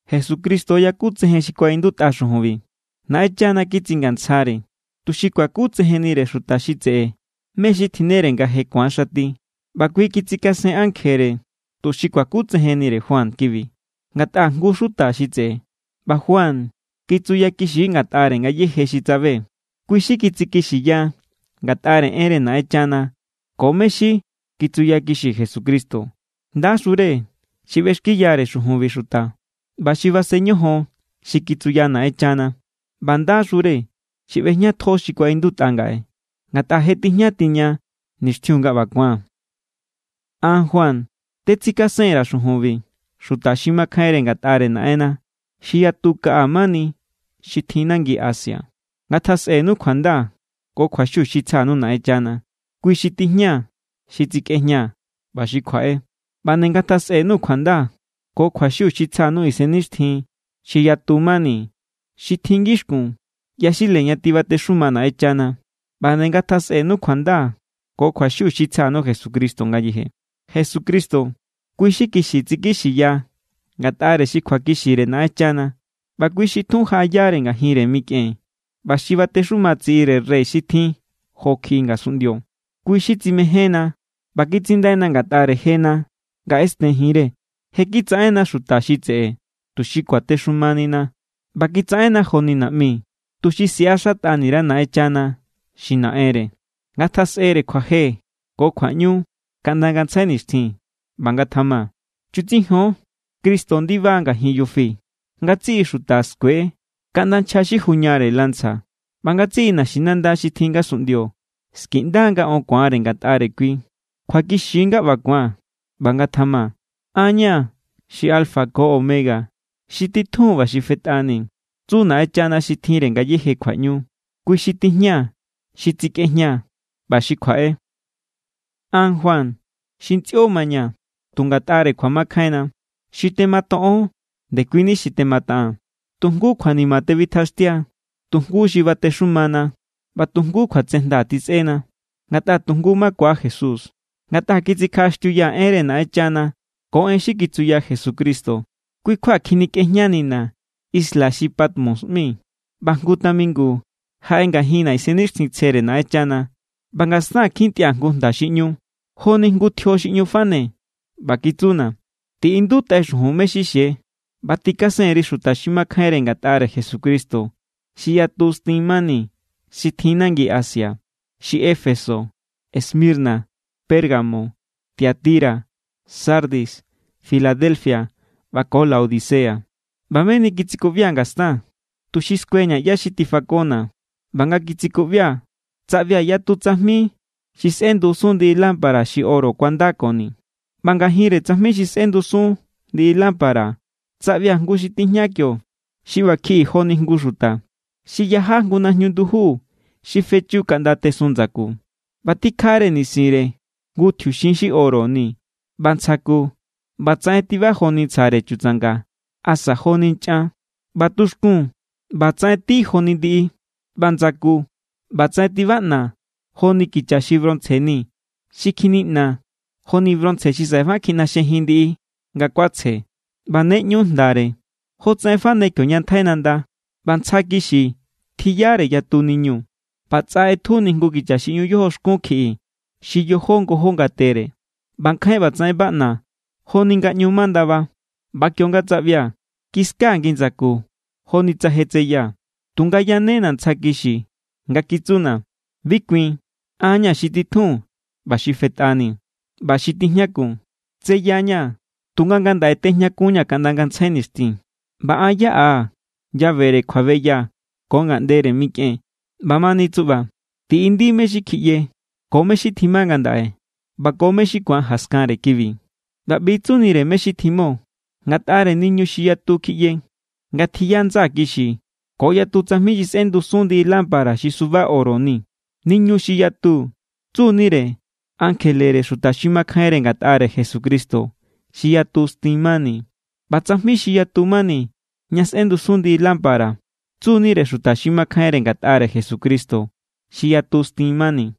Jesucristo yakutsejen xi kuaꞌindutꞌa xujunbi. Naꞌenchana kitsingantsjare, tuxi kuakutsejennire xuta xi tseꞌe me xi tjinnere nga je ku̱an xati. ꞌBa kui kitsikasen ankjere tuxi kuakutsejennire Juan kibi, ngatꞌa= jngu= xuta xi tseꞌe. ꞌBa Juan kitsuyakixi= ngatꞌare ngayéje xi tsabe. Kui= xi kitsikixiya ngatꞌare enre Naꞌenchana ko mé= xi kitsuyakixi Jesucristo. ¡Ndaxure xi ꞌbexkiyare xujunbi xuta ꞌba xi basen ñojon xi kitsuya Naꞌenchana! ꞌBa ¡ndaxure xi ꞌbejñatjo xi kuaꞌindutꞌa ngaꞌe, ngatꞌa je tijña tiña nixtjiun nga ꞌba ku̱an! An, Juan, tetsikasen_ra̱ xujunbi xuta xi makjainre ngatꞌare Naꞌenna xi yatu kaꞌa mani xi tjin nangi Asia. Ngatjasꞌenu kjuanda ko kjuaxiu xi tsja_nuu̱ Naꞌenchana. Kui xi tijña xi tsikꞌejña ꞌba xi kjuaꞌe. ꞌBa nde ngatjasꞌenu kjuanda ko kjuaxiu xi tsja_nuu̱ isennixtjin xi yatu mani xi tjin ngixkun yaxile ña tibatexuma Naꞌenchana. ꞌBa nde ngatjasꞌenu kjuanda ko kjuaxiu xi tsja_nuu̱ Jesucristo ngayeje. Jesucristo, kui xi kixi tsikixiya ngatꞌare xi kjuakixire Naꞌenchana, ꞌba kui xi tjun jaꞌayare ngajinre mikꞌen ꞌba xi batexuma tsiꞌire rey xi tjin jo kjiꞌi ngasunꞌndio. Kui= xi tsimejénna ꞌba kitsindaina ngatꞌare jena nga ꞌesten jinre. Je kitsaꞌenna xuta xi tseꞌe, tuxi kuatexumanina. ꞌBa kitsaꞌenna joni naꞌmi, tuxi siꞌaxatꞌani_ra Naꞌenchana xi Naꞌenre. ¡Ngatjasꞌere kjuaje ko kjuaꞌñu kaꞌnda ngantsjai nixtjin! ꞌBa ngatjama. Chutsijon, ¡Cristo ndiba= ngajin yufi! Ngatsiꞌi xuta skue=, kaꞌnda nchja xi juñare lanza. ꞌBa ngatsiꞌi naxinanda xi tjin ngasunꞌndio skiꞌnda= nga on ku̱anre ngatꞌare kui. Kjuakixi= nga ꞌba ku̱an, ꞌba ngatjama. “An= ña̱ xi alfa ko omega, xi titjun ꞌba xi fetꞌani”, tsu Naꞌenchana xi tjinre ngayéje kjuaꞌñu. Kui xi tijña xi tsikꞌejña ꞌba xi kjuaꞌe. An, Juan, xi ntsꞌio mañaa̱ tu ngatꞌare kjuamakjainna, xi tematoꞌon ndekuini xi temataꞌaa̱n. Tu jngu kjuanima tebitjaxtia, tu jngu xi batexumana, ꞌba tu jngu kjuatsejnda tjisꞌena, ngatꞌa tu jngu makua Jesús. Ngatꞌa kitsikjaꞌaxtiuyaa̱ enre Naꞌenchana ko en xi kitsuya Jesucristo, kui= kjua kjinikꞌejñanina̱ isla xi Patmos ꞌmi. ꞌBa jngu tamingu jaꞌe ngajinna̱ Isennixtjintsjere Naꞌenchana, ꞌba ngastaa̱n kjintꞌia̱ jngu jnda xi ꞌñu, joni jngu tjio xi ꞌñu fane. ꞌBa kitsuna̱: —Tiꞌindutꞌai xujun mé= xi xie ꞌba tikasen_ri xuta xi makjainre ngatꞌare Jesucristo xi yatu stin mani, xi tjin nangi Asia. Xi Éfeso, Esmirna, Pérgamo, Tiatira, Sardis, Filadelfia, ꞌba ko Laodicea. ꞌBa meni kitsikuꞌbia̱ ngastaa̱n, tuxi skueña̱ ꞌyá= xi tifakona̱. ꞌBa nga kitsikuꞌbia̱, tsaꞌbia̱ yatu tsajmi xi sꞌendusun ndiꞌi lámpara xi oro kuandakoni. ꞌBa ngajinre tsajmi xi sꞌendusun ndiꞌi lámpara tsaꞌbia̱ jngu xi tijña kio xi ꞌba kjiꞌi joni jngu xuta. Xi yaja jngu najñu nduju xi fechu kaꞌnda tesun ndsaku, ꞌba tikjare nisinre jngu tjiuxin xi oro ni. ꞌBa ntsja ku ꞌbatsaꞌen tiba joni ntsjare chutsanga asa joni nchꞌan. ꞌBa tuxkun, ꞌbatsaꞌen tí joni ndiꞌi. ꞌBa ndsaku, ꞌbatsaꞌen tibaꞌna̱ joni kicha xi bronce ni xi kjiniꞌna joni bronce xi saꞌe kjiꞌnaxjejin ndiꞌi nga kuatsje. ꞌBa ne ꞌñu jndare, jotsaꞌen fane kioña ntjai nanda. ꞌBa ntsja kixi tjiyare yatu niñu, ꞌba tsꞌa ꞌetjuni jngu kicha xi ꞌñu yojoxkun kjiꞌi xi yojó ngojó ngatere. ꞌBa nkjain ꞌbatsaꞌen baꞌna joni nga ꞌñu ma ndaba. ꞌBa kionga tsaꞌbia̱, kiskaa̱ ngi ndsaku joni tsa je tseyaa̱. Tunga yanena̱ ntsja kixi nga kitsuna̱: —Bi kuin. An= ña̱ xi titjun ꞌba xi fetꞌani ꞌba xi tijñakun. Tseya=ña̱, tunga ngandaꞌe tejñakunñaa̱ kaꞌnda ngantsjai nixtjin. ꞌBa an yaꞌaa̱ llavere kjuabeya ko ngaꞌndere mikꞌen. ꞌBamani tsuꞌba, tiꞌindi mé= xi kjiꞌye ko mé= xi tjima ngandaꞌe ꞌba ko mé= xi ku̱an jaskanre kibi. ꞌBa ꞌbi= tsunire mé= xi tjiꞌmo ngatꞌare niñu xi yatu kjiꞌye nga tjiya ndsaa̱ kixi ko yatu tsajmi xi sꞌendusun ndiꞌi lámpara xi suba oro ni. Niñu xi yatu, tsu=nire ankjelere xuta xi makjainre ngatꞌare Jesucristo xi yatu stin mani. ꞌBa tsajmi xi yatu mani ña sꞌendusun ndiꞌi lámpara, tsu=nire xuta xi makjainre ngatꞌare Jesucristo xi yatu stin mani.